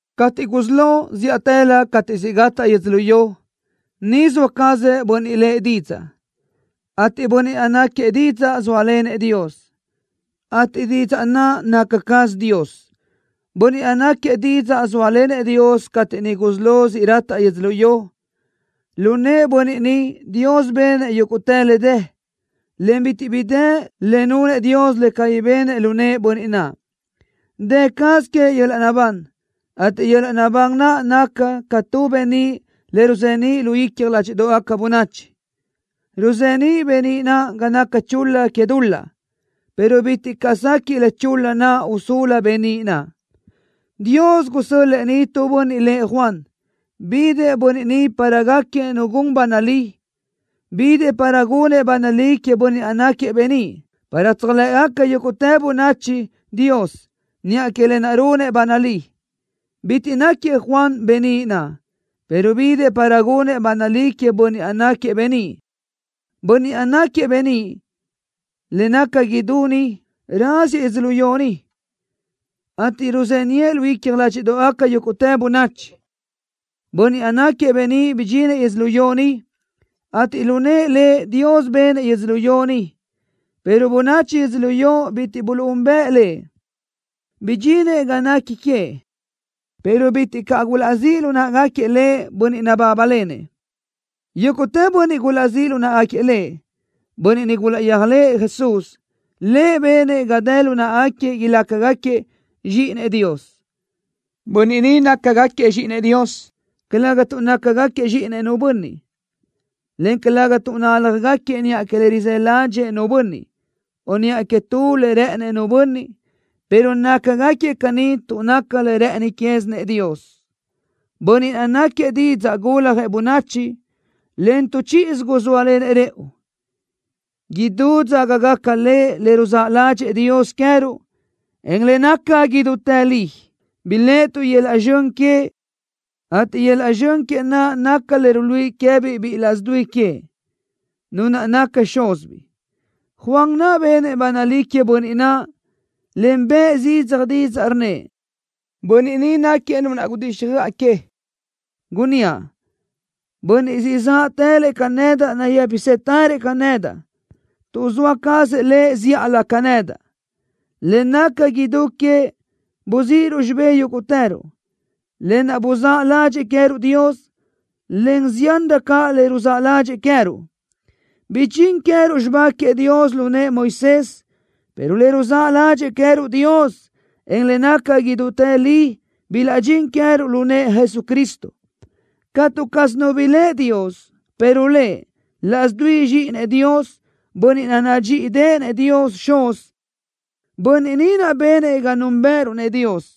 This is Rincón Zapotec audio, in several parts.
Cateʼ gusí lo, zíʼatëlö cateʼ siʼ gataʼ yödzölió, niʼ zoa cazëʼ Bönniʼ lëʼ Didzaʼ, ateʼ Bönniʼ naʼ náquiëʼ Didzaʼ zóalenëʼ Dios, ateʼ Didzaʼ naʼ naca caz Dios. Bönniʼ naʼ náquiëʼ Didzaʼ zóalenëʼ Dios cateʼ niʼ gusí lo siʼ rataʼ yödzölió. Lu nëʼë Bönniʼ ni, Dios benëʼ yúguʼtë le dë, en bitiʼ bi dë le nunëʼ Dios le cabí benëʼ lu nëʼë Bönniʼ naʼ. Dë caz queëʼ yöl-laʼ naʼbán, ateʼ yöl-laʼ naʼbán naʼ naca ca tu beníʼ le ruzeníʼ lu icja ládxiʼdoʼgaca bönachi. Ruzeníʼ beníʼ naʼ ga naca chul-la que dul-laʼ, pero bitiʼ caʼ sequiʼ le chul-la naʼ usulu beníʼ naʼ. Dios gusö́l-lëʼë ni tu bönniʼ lëʼ Juan. Bidëʼ bönniʼ ni para gáquiëʼ nu gun ba nalí. Bidëʼ para gunëʼ ba nalí queëʼ Bönniʼ naʼ náquiëʼ beníʼ, para tséjlëʼgaca yúguʼtë bönachi Dios niʼa que lë naʼ runëʼ ba nalí. Bitiʼ náquiëʼ Juan beníʼ naʼ, pero bidëʼ para gunëʼ ba nalí queëʼ Bönniʼ naʼ náquiëʼ beníʼ. Bönniʼ naʼ náquiëʼ beníʼ le naca idú niʼ raziëʼ yödzölió ni, ateʼ ruzeniʼë lu icja ládxiʼdoʼgaca yúguʼtë bönachi. Bönniʼ naʼ náquiëʼ beníʼ bidxinëʼ yödzölió ni, ateʼ lu nëʼë Lëʼ Dios benëʼ yödzölió ni, pero bönachi yödzölió bitiʼ buluʼúnbëʼë Lëʼ. Bidxinëʼ ga nequi queëʼ, pero bitiʼ caʼ gulaʼzíʼ lu náʼagaquiëʼ Lëʼ bönniʼ nabábalenëʼ. Yúguʼtë bönniʼ gulaʼzíʼ lu náʼagaquiëʼ Lëʼ, bönniʼ niʼ gulaʼyéajlëʼë Jesús, Lëʼ benëʼ ga dë lu náʼagaquiëʼ ilácagaquiëʼ zxíʼinëʼ Dios. Bönniʼ ni nácagaquiëʼ zxíʼinëʼ Dios, calëga tuʼ nácagaquiëʼ zxíʼinëʼ nu bönniʼ, en calëga tuʼ nálajgaquiëʼ niʼa que le rizë́ ládxëʼë nu bönniʼ, o niʼa que tu le rë́ʼënëʼ nu bönniʼ, pero nácagaquiëʼ caní tuʼ naca le rë́ʼëni quézinëʼ Dios. Bönniʼ naʼ náquiëʼ Didzaʼ guljëʼ bönachi, en tu chíʼisö guzóalenëʼ rëʼu, idú dzágagaca Lëʼ le ruzáʼ ládxëʼë Dios queë́ruʼ, en le naca idútë li. Biléʼetuʼ yöl-laʼ zxön queëʼ, ateʼ yöl-laʼ zxön queëʼ naʼ naca le ruíʼi queë́biʼ biʼi laʼs dui que, Nu naʼ naca Xúzibiʼ. Juan naʼ benëʼ ba nalí queëʼ Bönniʼ naʼ, en bëʼë zidzaj didzaʼ, rnnëʼ: —Bönniʼ ni náquiëʼ Nu naʼ gudíxjöʼa que, gunníaʼ: Bönniʼ siʼ záʼtëlëʼ ca nedaʼ nayë́pisëtërëʼ ca nedaʼ, tuʼ zoa cazëʼ Lëʼ zíʼalö ca nedaʼ. Le naca idú queëʼ buzíʼiruʼ xibé yúguʼtëruʼ, lë naʼ buzáʼ ládxëʼë queë́ruʼ Dios, en ziánrö caʼ le ruzáʼ ládxëʼë queë́ruʼ. Bidxín queë́ruʼ xibá queëʼ Dios lu nëʼë Moisés, pero le ruzáʼ ládxëʼë queë́ruʼ Dios, en le naca idútë li bilaʼdxín queë́ruʼ lu nëʼë Jesucristo. Catu caz nu biléʼe Dios, pero Lëʼ, laʼs dui Zxíʼinëʼ Dios, Bönniʼ naʼ nadxíʼideʼenëʼ Dios Xuz, Bönniʼ ni naʼ benëʼ ga núnbëʼëruʼ-nëʼ Dios.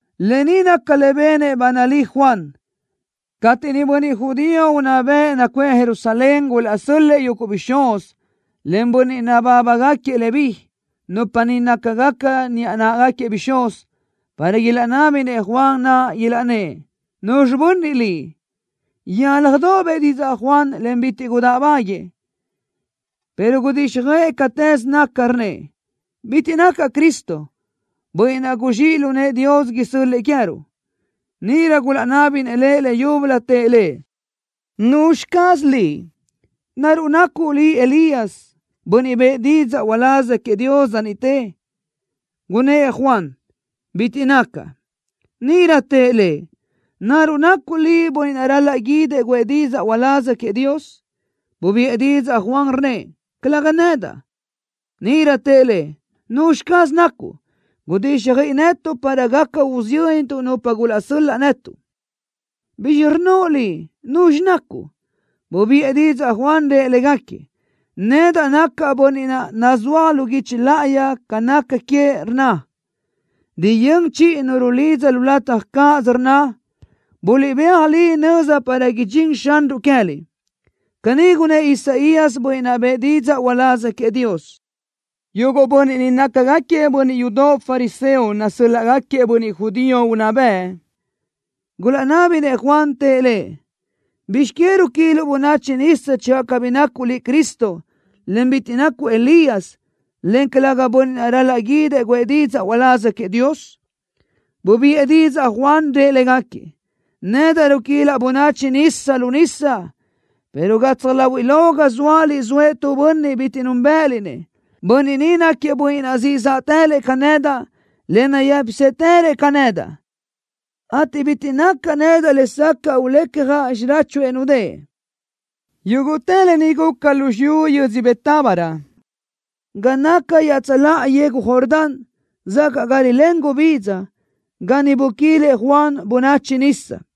Lë ni naca le benëʼ ba nalí Juan, cateʼ niʼ bönniʼ judío unná bëʼ nacuʼë Jerusalén gulaʼsö́l-lëʼë yuguʼ bixúz, en bönniʼ nabábagaquiëʼ Leví, nupa ni nácagaca niʼa náʼagaquiëʼ bixúz, para ilaʼnábinëʼ Juan naʼ, ilaʼnnë́ʼ: —¿Nuzxi bönniʼ liʼ? Yálajdoʼ bëʼë didzaʼ Juan, en bitiʼ gudáʼbaguiëʼ, pero gudíxjöʼë catëz naca, rnnëʼ: —Bitiʼ nacaʼ Cristo, Bönniʼ naʼ guzxíʼ lu nëʼë Dios isö́l-lëʼë queë́ruʼ. Níʼirö gulaʼnábinëʼ lëʼ leyúbölö, tëʼ lëʼ: —¿Nuzxi caz liʼ? ¿Naruʼ nacuʼ liʼ Elías, bönniʼ bëʼë didzaʼ uláz queëʼ Dios dza niʼtë? Gunnë́ʼ Juan: —Bitiʼ nacaʼ. Níʼirö tëʼ lëʼ: —¿Naruʼ nacuʼ liʼ bönniʼ naʼ ral-laʼ guídëʼ guʼë didzaʼ uláz queëʼ Dios? Bubiʼë didzaʼ Juan, rnnëʼ: —Calëga nedaʼ. Níʼirö tëʼ lëʼ: —¿Nuzxi caz nacuʼ? Gudíxjöiʼi netuʼ para gaca usiyöntuʼ nupa gulaʼsö́l-laʼ netuʼ. ¿Bizxi rnnoʼ liʼ nuzxi nacuʼ? Bubiʼë didzaʼ Juan, rëʼ légaquiëʼ: —Nedaʼ nacaʼ bönniʼ naʼ, nazúaj lu guichi láʼayi ca naca queëʼ, rnna: Riyö́n chiʼi nu rulidza lu lataj cáʼasö, rnna: Buliʼbéaj li nöza para idxín Xanruʼ queë́liʼ. Caní gunnë́ʼ Isaías, bönniʼ naʼ bëʼë didzaʼ uláz queëʼ Dios. Yuguʼ bönniʼ ni nácagaquiëʼ bönniʼ yudoʼ fariseo nasö́l-laʼgaquiëʼ bönniʼ judío unná bëʼ. Gulaʼnábinëʼ Juan, tëʼ lëʼ: —¿Bizx que ruquiluʼ bönachi nisa channö cabí nacuʼ liʼ Cristo, en bitiʼ nacuʼ Elías, en calëga bönniʼ naʼ ral-laʼ guídëʼ guʼë didzaʼ uláz queëʼ Dios? Bubiʼë didzaʼ Juan naʼ, rëʼ légaquiëʼ: —Nedaʼ ruquilaʼ bönachi nisa lu nisa, pero gatsaj láhuiʼlö ga zóaliʼ zoëʼ tu bönniʼ bitiʼ núnbëʼëliʼ-nëʼ. Bönniʼ ni náquiëʼ Bönniʼ naʼ siʼ záʼtëlëʼ ca nedaʼ, en nayë́pisëtërëʼ ca nedaʼ, ateʼ bitiʼ nacaʼ nedaʼ lesacaʼ ulecjaʼ xiráchuëʼ nudë́ʼë. Yúguʼtë lë ni guca lu xiyú yödzö Betábara, ga naca iaʼtsöláʼa yegu Jordán, zacaʼ ga rilén gubidza, ga niʼ buquilëʼ Juan bönachi nisa.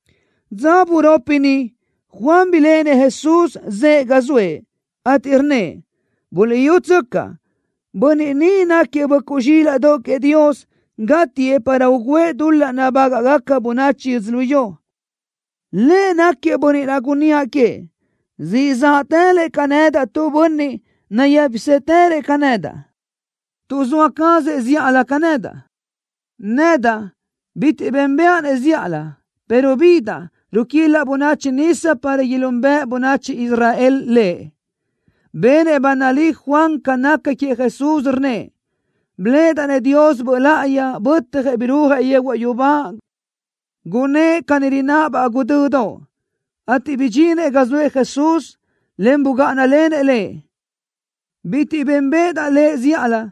Dza buropi niʼ Juan biléʼenëʼ Jesús, zëʼë ga zoëʼ, ateʼ rnnëʼ: —Buliʼyútsöcaʼ. Bönniʼ ni náquiëʼ böʼcuʼ zxílaʼdoʼ queëʼ Dios, gátiëʼ para ugǘëʼ dul-laʼ nabágaʼgaca bönachi yödzölió. Lëʼ náquiëʼ bönniʼ naʼ gunníaʼ queëʼ: “Siʼ záʼtëlëʼ ca nedaʼ tu bönniʼ, nayë́pisëtërëʼ ca nedaʼ, tuʼ zoa cazëʼ zíʼalö ca nedaʼ.” Nedaʼ bitiʼ bénbëʼa-nëʼ zíʼalö, pero bidaʼ, ruquilaʼ bönachi nisa para ilúnbëʼe bönachi Israel Lëʼ. Benëʼ ba nalí Juan ca naca queëʼ Jesús, rnnëʼ: —Biléʼedaʼ-nëʼ Dios Böʼ Láʼayi, bötjëʼ birúajëʼ yehuaʼ yubá, gunë́ʼë ca rináʼabaʼ guʼdödoʼ, ateʼ bidxinëʼ ga zoëʼ Jesús, en bugáʼanalenëʼ Lëʼ. Bitiʼ bénbeʼedaʼ Lëʼ zíʼalö.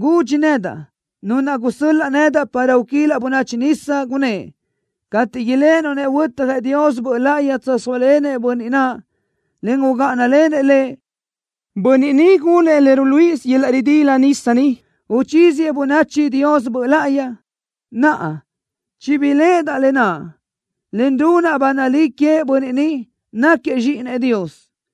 Gudxi nedaʼ Nu naʼ gusö́l-laʼ nedaʼ para uquilaʼ bönachi nisa, gunnë́ʼ: “Cateʼ iléʼenuʼ-nëʼ huötjëʼ Dios Böʼ Láʼayi, tsöjsóalenëʼ Bönniʼ naʼ, en ugáʼanalenëʼ Lëʼ, Bönniʼ ni gunëʼ le ruluíʼisö yöl-laʼ ridila nisa ni, uchíziëʼ bönachi Dios Böʼ Láʼayi.” Naʼa, chibiléʼedaʼ lë naʼ, en runaʼ ba nalí queëʼ Bönniʼ ni, náquiëʼ Zxíʼinëʼ Dios.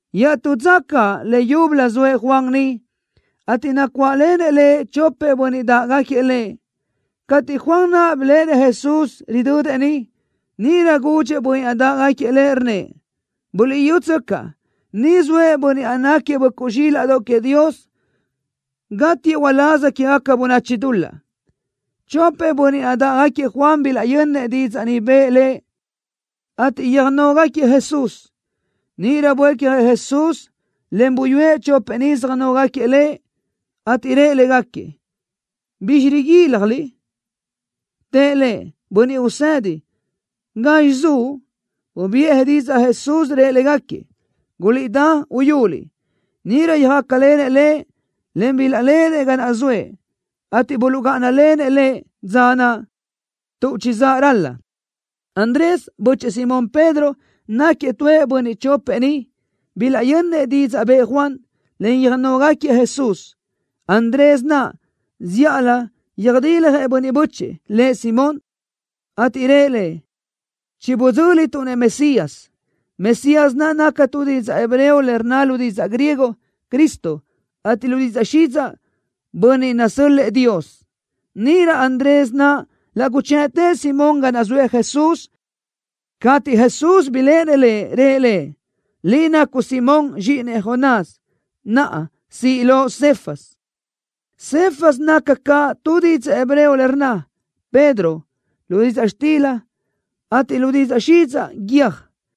Iaʼtú dza caʼ, leyúbölö zoëʼ Juan niʼ, ateʼ nacuáʼlenëʼ lëʼ chopëʼ bönniʼ dáʼgaquiëʼ lëʼ. Cateʼ Juan naʼ biléʼenëʼ Jesús, ridödëʼ niʼ, níʼirö gudxëʼ bönniʼ naʼ dáʼgaquiëʼ lëʼ, rnnëʼ: —Buliʼyutsöcaʼ. Niʼ zoëʼ bönniʼ naʼ náquiëʼ böʼcuʼ zxílaʼdoʼ queëʼ Dios, gatiëʼ uláz quegaca bönachi dul-laʼ. Chopëʼ bönniʼ naʼ dáʼgaquiëʼ Juan bilaʼyönnëʼ didzaʼ ni bëʼë lëʼ, ateʼ yöjnógaquiëʼ Jesús. Níʼirö buécjëʼ Jesús, en buyúëʼ chopëʼ ni söjnógaquiëʼ Lëʼ, ateʼ rëʼ légaquiëʼ: —¿Bizxi riguíljaliʼ? Tëʼ Lëʼ: —Bönniʼ Usedi, ¿gazxi zuʼ? Bubiʼë didzaʼ Jesús, rëʼ légaquiëʼ: —Guliʼdá, uyuliʼ. Níʼirö yöjácalenëʼ Lëʼ, en bilaʼléʼenëʼ ga naʼ zoëʼ, ateʼ buluʼgáʼanalenëʼ Lëʼ dza naʼ, tuʼ chizáʼ ral-la. Andrés, bö́chëʼë Simón Pedro, náquiëʼ tuëʼ bönniʼ chopëʼ niʼ bilaʼyönnëʼ didzaʼ bëʼë Juan, en yöjnógaquiëʼ Jesús. Andrés naʼ, zíʼalö yöjdiljëʼ bönniʼ bö́chëʼë, lëʼ Simón, ateʼ rëʼ lëʼ: —Chibidzö́lituʼ-nëʼ Mesías. Mesías naca tu didzaʼ hebreo le rnna lu didzaʼ griego: Cristo, ateʼ lu didzaʼ xidzaʼ: Bönniʼ nasö́l-lëʼë Dios. Níʼirö Andrés naʼ laʼ guchëʼtëʼ Simón ga naʼ zoëʼ Jesús. Cateʼ Jesús biléʼenëʼ lëʼ, rëʼ lëʼ: —Liʼ nacuʼ Simón, zxíʼinëʼ Jonás. Naʼa, siʼ loʼ Cefas. Cefas naca caʼ tu didzaʼ hebreo le rnna: Pedro, lu didzaʼ xtila, ateʼ lu didzaʼ xidzaʼ: Guiö́j.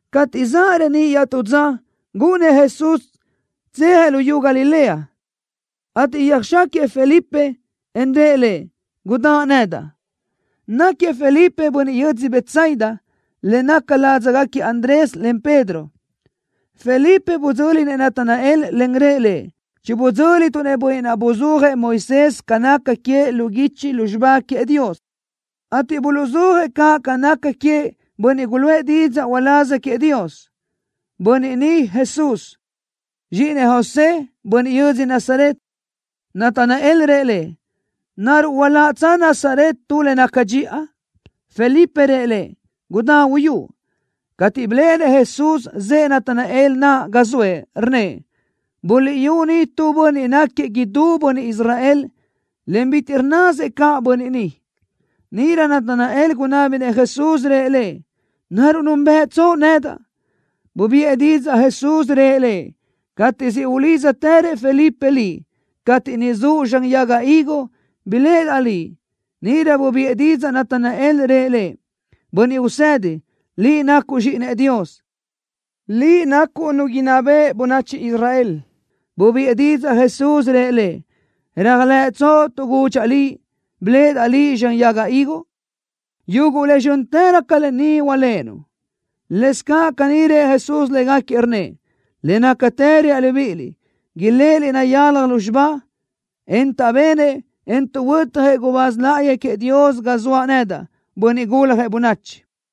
Cateʼ zaʼ reníʼ iaʼtú dza, gúʼunnëʼ Jesús tsejëʼ luyú Galilea, ateʼ yöjxáquiëʼ Felipe, en rëʼ lëʼ: —Gudáʼ nedaʼ. Náquiëʼ Felipe bönniʼ yödzö Betsaida, le naca ládzagaquiëʼ Andrés, en Pedro. Felipe budzö́linëʼ Natanael, en rëʼ lëʼ: —Chibidzö́lituʼ-nëʼ bönniʼ naʼ buzúajëʼ Moisés ca naca queëʼ lu guichi lu xibá queëʼ Dios, ateʼ buluʼzúajëʼ caʼ ca naca queëʼ bönniʼ guluʼë didzaʼ uláz queëʼ Dios. Bönniʼ ni Jesús, zxíʼinëʼ José, bönniʼ yödzö Nazaret. Natanael rëʼ lëʼ: —¿Naruʼ hualaʼtsö Nazaret tu le naca dxiʼa? Felipe rëʼ lëʼ: —Gudá uyúʼ. Cateʼ biléʼenëʼ Jesús zëʼë Natanael naʼ ga zoëʼ, rnnëʼ: —Buliʼyú ni tu bönniʼ náquiëʼ idú bönniʼ Israel, en bitiʼ rnnasëʼ caʼ bönniʼ ni. Níʼirö Natanael gunábinëʼ Jesús, rëʼ Lëʼ: —¿Naruʼ núnbëʼtsoʼ nedaʼ? Bubiʼë didzaʼ Jesús, rëʼ lëʼ: —Cateʼ siʼ ulídzatërëʼ Felipe liʼ, cateʼ niʼ zuʼ zxan yaga higo, biléʼedaʼ liʼ. Níʼirö bubiʼë didzaʼ Natanael, rëʼ Lëʼ: —Bönniʼ Usedi, Liʼ nacuʼ Zxíʼinëʼ Dios. Liʼ nacuʼ Nu inná beʼe bönachi Israel. Bubiʼë didzaʼ Jesús, rëʼ lëʼ: —¿Réajlëʼtsoʼ tuʼ gudxaʼ liʼ: Biléʼedaʼ liʼ zxan yaga higo? Yuguʼ le zxö́ntërö ca lë ni hualéʼenuʼ. Lëscaʼ caní rëʼ Jesús légaquiëʼ, rnnëʼ: —Le nácatë reaʼ libíʼiliʼ, iléʼeliʼ nayalaj lúzxiba, en taʼbenëʼ, en tuʼhuötjëʼ gubáz láʼayi queëʼ Dios ga zoaʼ nedaʼ, Bönniʼ Guljëʼ Bönachi.